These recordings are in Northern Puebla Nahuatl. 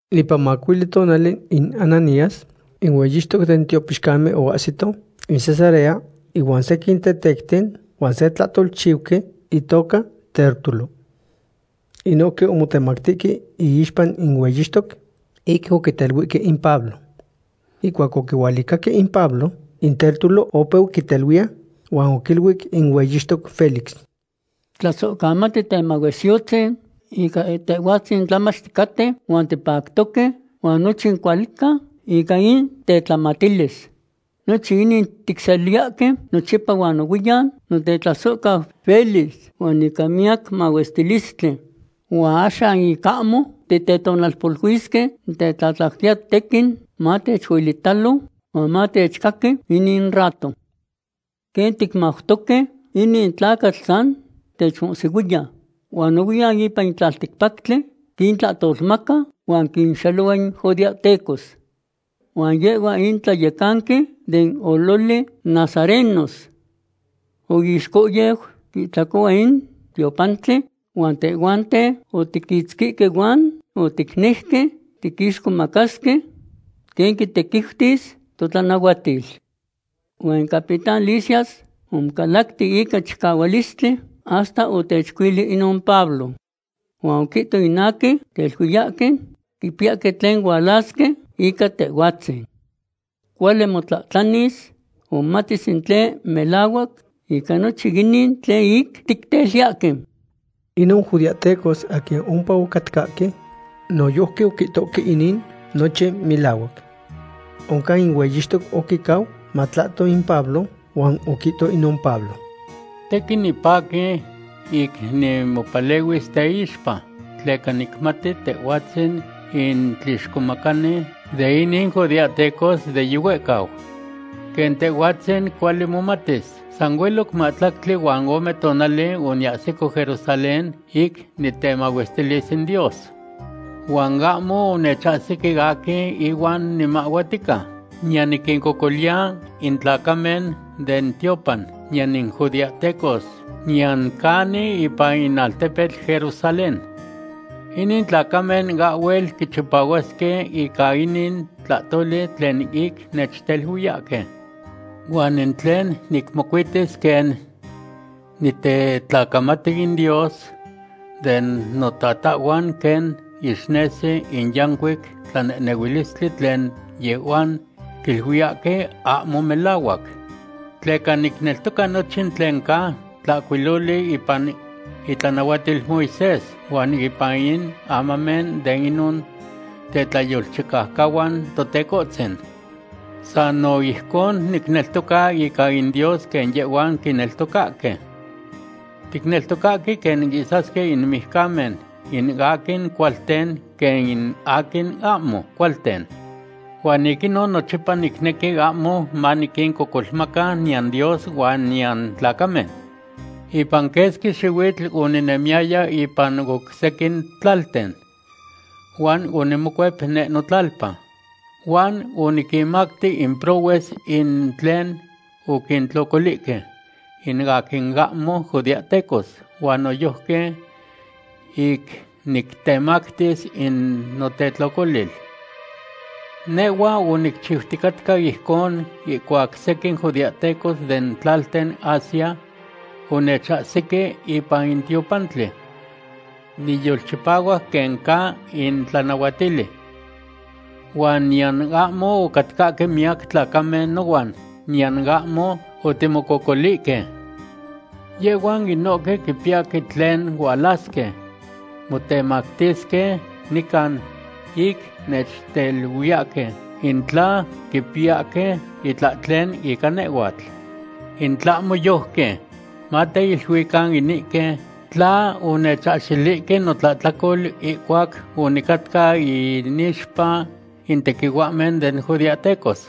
Ipan macuili tonali in Ananías in hueyixtoc den tiopixcamen oahsito in Cesarea inuan sequin tetecten huan se tlahtolchiuqui, itoca Tértulo. Inohque omotemactihque iixpa in hueyixtoc ic oquiteluihque in Pablo. Ihcuac oquihualicahque in Pablo, in Tértulo opeu quiteluiya, huan oquiluic in hueyixtoc Félix: ―Tlasohcamati temahuesiyotzin, ica tehhuatzin tlamach ticaten huan tipactoque, huan nochin cuali ca ica in tetlamatilis. Nochin inin ticseliyahque nochipa huan nohuiyan, notetlasohcau Félix, huan ica miyac mahuestilistli. Huan axan ic ahmo titetonalpoluisque, nitetlatlautiya tequin matechuelitalo huan matechcaqui inin rato. Quen ticmautoque, inin tlacatl san techmohsihuiya. Huan nohuiyan ipan in tlalticpactli quintlahtolmaca huan quinxelohua in judeahtecos. Huan yehhua in tlayecanqui den ololi nazarenos. Oixcohyeu quihtlacohua in tiopantli huan tehhuanten otiquitzquihque huan oticnejque tiquixcomacasque quen quitequiutis totlanahuatil. Huan in capitán Lisias omocalacti ica chicahualistli hasta otechcuili inon Pablo. Huan oquihto in aquin quiteluiyahque quipiyahque tlen hualasque ica tehhuatzin. Cuali motlahtlanis huan momatis in tlen melahuac ica nochin inin tlen ic ticteluiyahque. Inon judeahtecos aquin ompa ocatcahque noyojqui oquihtohque inin nochin melahuac. Oncan in hueyixtoc oquicau matlahto in Pablo, huan oquihto inon Pablo: ―Tequin nipaqui ic nimopalehuis teixpa tleca nicmati tehhuatzin in tlixcomacani de inin judeahtecos de yihuehcau. Quen tehhuatzin cuali momatis, san hueloc mahtlactli huan ome tonali oniahsico Jerusalén ic nitemahuestilis in Dios. Huan ahmo onechahsique aquin ihuan nimahhuatica, niyan niquincocoliya in tlacamen den tiopan, niyan in judeahtecos niyan canin ipan in altepetl Jerusalén. Inin tlacamen ahhuel quichipahuasque ica inin tlahtoli tlen ic nechteluiyahque. Huan in tlen nicmocuitis quen nitetlacamati in Dios de notatahhuan quen ixnesi in yancuic tlanehnehuilistli tlen yehhuan quiluiyahque ahmo melahuac. Tleca nicneltoca nochin tlen ca tlahcuiloli ipan itlanahuatil Moisés huan ipan in amamen de inon tetlayolchicaucahuan Totecohtzin. San no ijcon nicneltoca ica in Dios quen yehhuan quineltocahque. Ticneltocahque quen ihsasque in mijcamen, in aquin cualten quen in aquin ahmo cualten. Huan ic inon nochipa nicnequi ahmo maniquincocolmaca niyan Dios huan niyan tlacamen. ’Ipan quesqui xihuitl oninemiyaya ipan oc sequin tlalten, huan onimocuep neh notlalpa. Huan oniquinmacti in prohues in tlen oquintlocolihque in aquin ahmo judeahtecos huan noyojqui ic nictemactis in notetlocolil. Nehhua onichiuticatca ijcon ihcuac sequin judeahtecos den tlalten Asia onechahsique ipan in tiopantli niyolchipahuac quen ca in tlanahuatili. Huan niyan ahmo ocatcahque miyac tlacamen nohuan, niyan ahmo otimocococolihque. Yehhuan inohque quipiyahque tlen hualasque motemactisque nican ic nechteluiyahque in tla quipiyahque itlahtlen ica nehhuatl. In tlahmo yojqui, mateiluican inihque tla onechahxilihque notlahtlacol ihcuac onicatca inixpa in tequihuahmen den judeahtecos.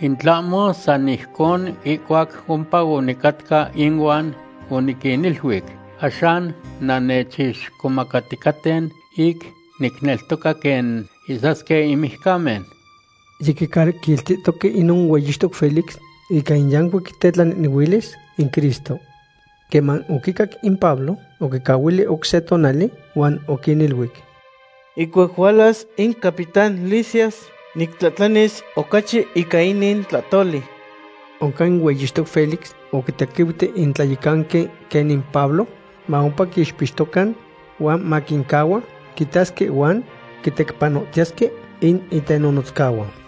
In tlahmo san ijcon ihcuac ompa onicatca inuan oniquiniluic: “Axan nannechixcomacaticaten ic nicneltoca quen ihsasque in mijcamen.” Yiquicaquiltihtoque inon hueyixtoc Félix ica in yancuic tetlanehnehuilis in Cristo. Queman oquicac in Pablo, oquincahuili oc se tonali huan oquiniluic: ―Ihcuac hualas in capitán Lisias nictlahtlanis ocachi ican inin tlahtoli. Oncan in hueyixtoc Félix oquitequiuti in tlayecanqui quenin Pablo ma ompa quiixpixtocan, huan maquincahua quitasque huan quitecpanohtiyesque in itenonotzcahuan.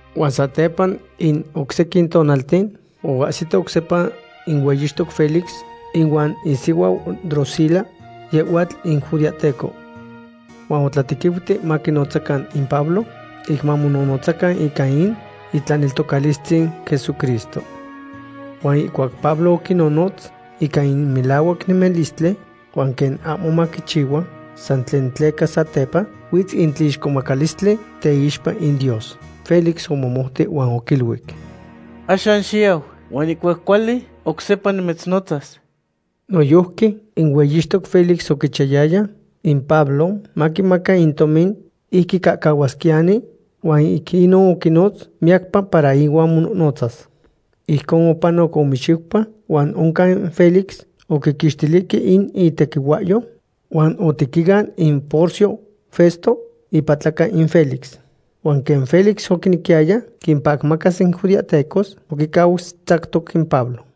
Huan satepa in oc sequin tonalten oahsito oc sepa in hueyixtoc Félix ihuan isihuau Drusila, yehhuatl in judeahteco. Huan otlatequiuti maquinotzacan in Pablo ic mamonohnotzacan ican in itlaneltocalistzin Jesucristo. Huan ihcuac Pablo oquinonotz ican in melahuac nemilistli huan quen ahmo maquichihua san tlen tleca satepa huitz in tlixcomacalistli teixpa in Dios, Félix omomouti huan oquiluic: ―Axan xiyau, huan ihcuac cuali, oc sepa nimitznotzas. Noyojqui in hueyixtoc Félix oquichiyayaya in Pablo maquimaca in tomin ic quicahcahuasquiyani, huan ic inon oquinotz miyacpa para ihuan monohnotzas. Ijcon opanoc ome xiupa huan oncan Félix oquiquixtilihque in itequihuahyo huan otequian in Porcio Festo, ipatlaca in Félix. Huan quen Félix oquinequiyaya quimpacmacas in judeahtecos, oquicau tzactoc in Pablo.